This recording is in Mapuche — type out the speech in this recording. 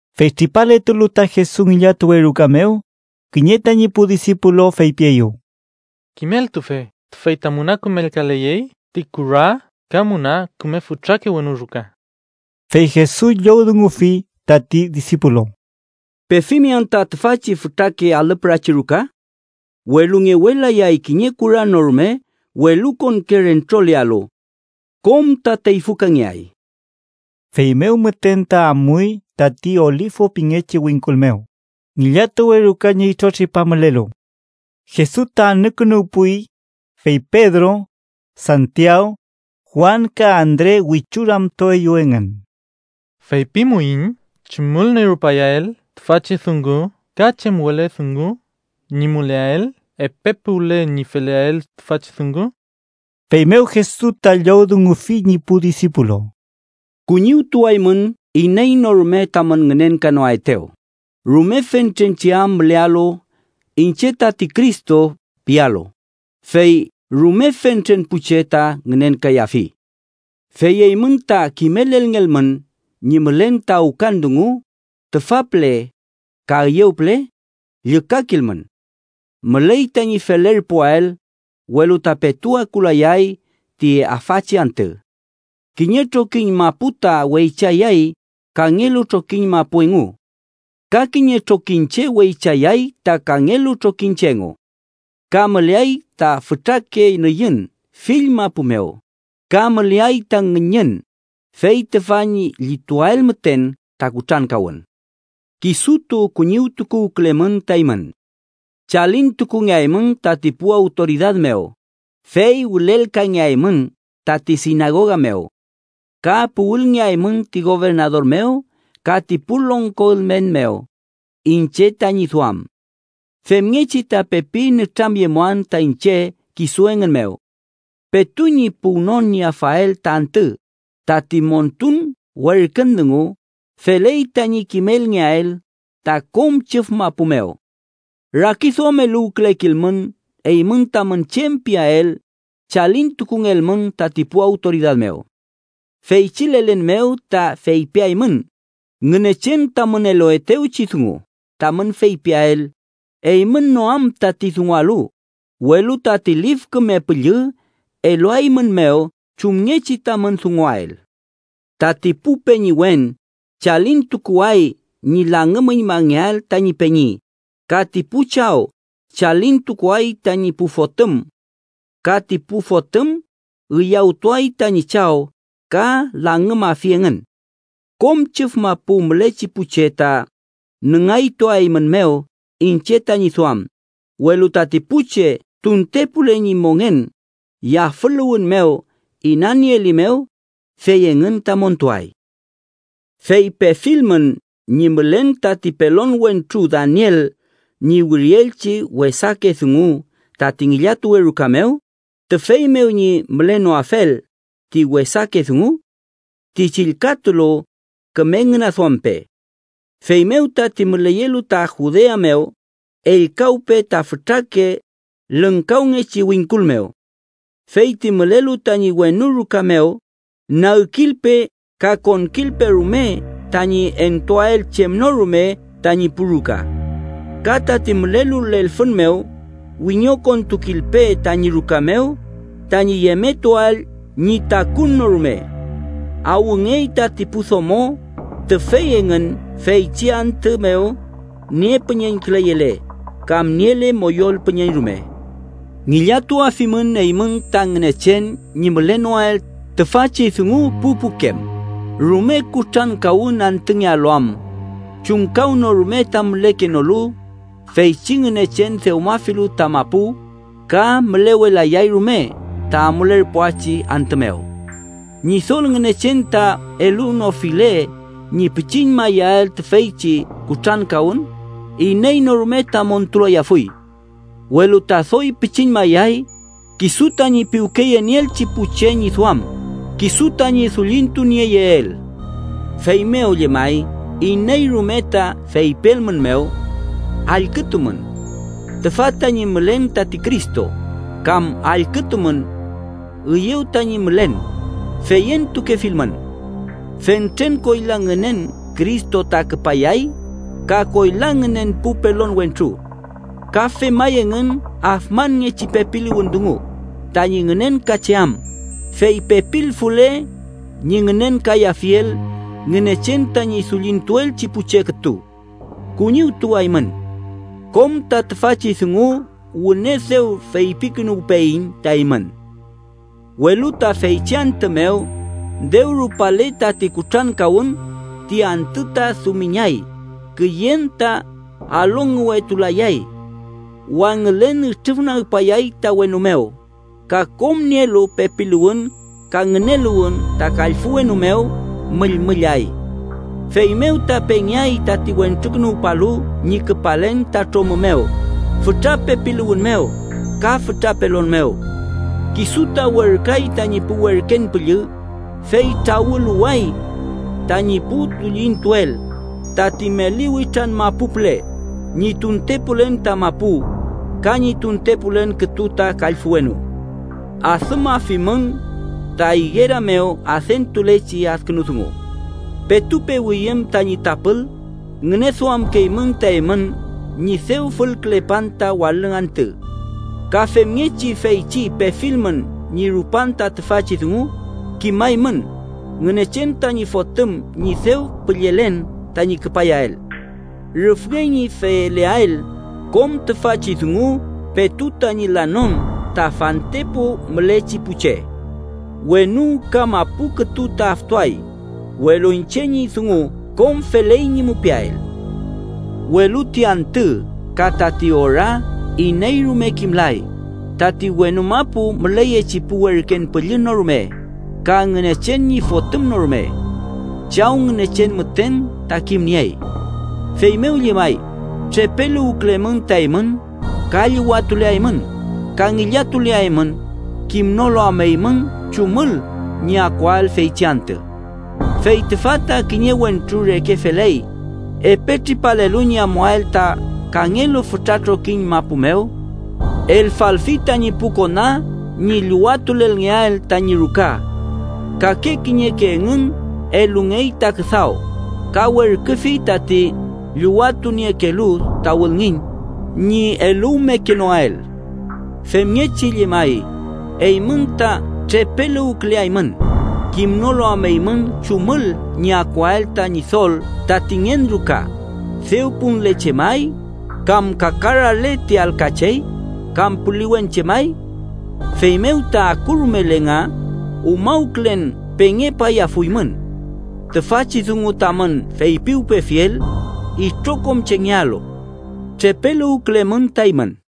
Fey tripaletulu ta Jesus ngillatuwe ruka mew, kiñe tañi pu disipulu feypieyew: —¡Kimeltufe, tüfey ta müna kümelkaleyey ti kura ka müna küme fütrake wenu ruka! Fey Jesus llowdungufi tati disipulu: —¿Pefimi anta tüfachi fütrake alü pürachi ruka? Welu ngewelayay kiñe kura no rume welukonke rentrolealu. Kom ta teyfükangeay. Feymew müten ta amuy tati Olifu pingechi wingkul mew, ngillatuwe ruka ñi itrotripa mülelu. Jesus ta anükünuwpuy, fey Pedro, Santiaw, Juan ka Andre wichu ramtueyew engün: —Feypimuiñ chumül ñi rupayael tüfachi dungu ka chem wele dungu ñi müleael epe puwle ñi feleael tüfachi dungu. Feymew Jesus ta llowdungufi ñi pu disipulu: —Kuñiwtuaymün iney no rume tamün ngünenkanoaetew, rume fentren che am mülealu ‘iñche tati Cristo’ pialu, fey rume fentren pu che ta ngünenkayafi. “Fey eymün ta kimelelngelmün ñi mülen ta awkan dungu tüfa püle ka üyew püle, llükakilmün. Müley tañi felerpuael, welu ta petu akulayay ti afachi antü. Kiñe trokiñ mapu ta weychayay kangelu trokiñ mapu engu ka kiñe trokiñche wechayay ta kangelu trokiñche engu. Ka müleay ta fütrake nüyün fill mapu mew, ka müleay ta ngüñün, fey tüfa ñi llituael müten ta kutrankawün. “Kisutu kuñiwtuwkülemün ta eymün. Chalintukungeaymün tati pu awtoridad mew, fey wülelkangeaymün tati sinagoga mew. Ka puwülngeaymün ti gobernador mew ka ti pu longko ülmen mew iñche tañi duam. Femngechi ta pepi nütramyemuan ta iñche kisu engün mew. Petu ñi puwnon ñi afael ta antü, tati montun werkün dungu feley tañi kimelngeael ta kom chüf mapu mew. “Rakiduameluwkülekilmün eymün tamün chem piael chalintukungelmün tati pu awtoridad mew. Feychi lelen mew ta feypiaymün Ngünechen tamün eluetewchi dungu tamün feypiael, eymün no am tati dungualu, welu tati Lif Küme Püllü eluaeymünmew chumngechi tamün dunguael. Tati pu peñiwen chalintukuay ñi langümüñmangeael tani peñi, ka ti pu chaw chalintukuay tañi pu fotüm. Ka ti pu fotüm üyawtuay tañi chaw ka langümafi engün. Kom chüf mapu mülechi pu che ta nüngaytuaeymünmew iñche tañi duam, welu tati pu che tuntepule ñi mongen yafüluwün mew inanieelimew, fey engün ta montuay. “Fey pefilmün ñi mülen tati pelon wentru Daniel ñi wirielchi wesake dungu tati ngillatuwe ruka mew, tüfey mew ñi mülenoafel ti wesake dungu ―ti chillkatulu, küme ngüneduampe― feymew tati müleyelu ta Judea mew, ellkawpe ta fütrake lüngkawngechi wingkul mew. Fey ti mülelu tañi wenu ruka mew, nagkilpe ka konkilpe rume tañi entuael chem no rume tañi pu ruka. Ka tati mülelu lelfün mew, wiñokontukilpe tañi ruka mew tañi yemetuael ñi takun no rume. ¡Awngey tati pu domo tüfey engün feychi antü mew niepüñeñküleyele kam niele moyol püñeñ rume! Ngillatuafimün eymün ta Ngünechen ñi mülenoael tüfachi dungu pu pukem, rume kutrankawün antüngealu am chumkawnorume ta mülekenolu feychi Ngünechen dewmafilu ta mapu ka mülewelayay rume ta amulerpuachi antü mew. Ñidol Ngünechen ta elunofile ñi pichiñmayael tüfeychi kutrankawün, iney no rume ta montulayafuy. Welu ta doy pichiñmayay kisu tañi piwkeyenieelchi pu che ñi duam, kisu tañi dullintunieyeel. “Feymew llemay iney rume ta feypielmünmew: ‘Allkütumün. Tüfa tañi mülen tati Cristo’, kam ‘Allkütumün. Üyew tañi mülen’, feyentukefilmün. Fentren koyla ngünen Cristo ta küpayay ka koyla ngünen pu pelon wentru. Ka femay engün afmanngechi pepiluwün dungu tañi ngünenkacheam, fey pepilfule, ñi ngünenkayafiel Ngünechen tañi dullintuelchi pu che kütu. ¡Kuñiwtuwaymün! Kom ta tüfachi dungu wüne dew feypikünuwpeyiñ ta eymün. “Welu ta feychi antü mew, dew rupale tati kutrankawün, ‘ti antü ta dumiñay, küyen ta alongüwetulayay. Wangülen ütrüfnagpayay ta wenu mew ka kom nielu pepiluwün ka ngüneluwün ta kallfü wenu mew müllmüllay.’ “Feymew ta pengeay tati Wentrukünuwpalu ñi küpalen ta tromü mew fütra pepiluwün mew ka fütra pelon mew. Kisu ta werküay tañi pu werken püllü, fey trawüluway tañi pu dullintuel tati meli witran mapu püle, ñi tuntepulen ta mapu ka ñi tuntepulen kütu ta kallfü wenu. “Adümafimün ta igera mew adentulechi adkünu dungu: petu pewüyüm tañi tapül, ngüneduamkeymün ta eymün ñi dew fülkülepan ta walüng antü. Ka femngechi feychi pefilmün ñi rupan ta tüfachi dungu, kimaymün Ngünechen tañi Fotüm ñi dew püllelen tañi küpayael. Rüfngey ñi feleael kom tüfachi dungu petu tañi lanon ta fantepu mülechi pu che. Wenu ka mapu kütu ta aftuay, welu iñche ñi dungu kom feley ñi mupiael. “Welu ti antü ka tati ora iney rume kimlay, tati wenu mapu müleyechi pu werken püllü no rume, ka Ngünechen ñi Fotüm no rume. Chaw Ngünechen müten ta kimniey. “Feymew llemay, trepeluwkülemün ta eymün ka llüwatuleaymün ka ngillatuleaymün, kimnolu am eymün chumül ñi akuael feychi antü. Fey tüfa ta kiñe wentru reke feley, epe tripalelu ñi amuael ta kangelu fütra trokiñ mapu mew. Elfalfi tañi pu kona ñi llüwatulelngeael tañi ruka. Kake kiñeke engün elungey ta küdaw, ka werküfi tati llüwatuniekelu ta wülngiñ ñi eluwmekenoael. Femngechi llemay, eymün ta trepeluwküleaymün, kimnolu am eymün chumül ñi akuael ta Ñidol tati ngen ruka: dew punle chemay, kam kakarale ti alka chey, kam puliwen chemay. Feymew ta akurumele nga, umawkülen pengepayafuymün. Tüfachi dungu tamün feypiwpefiel, itrokom chengealu: ¡Trepeluwkülemün ta eymün!”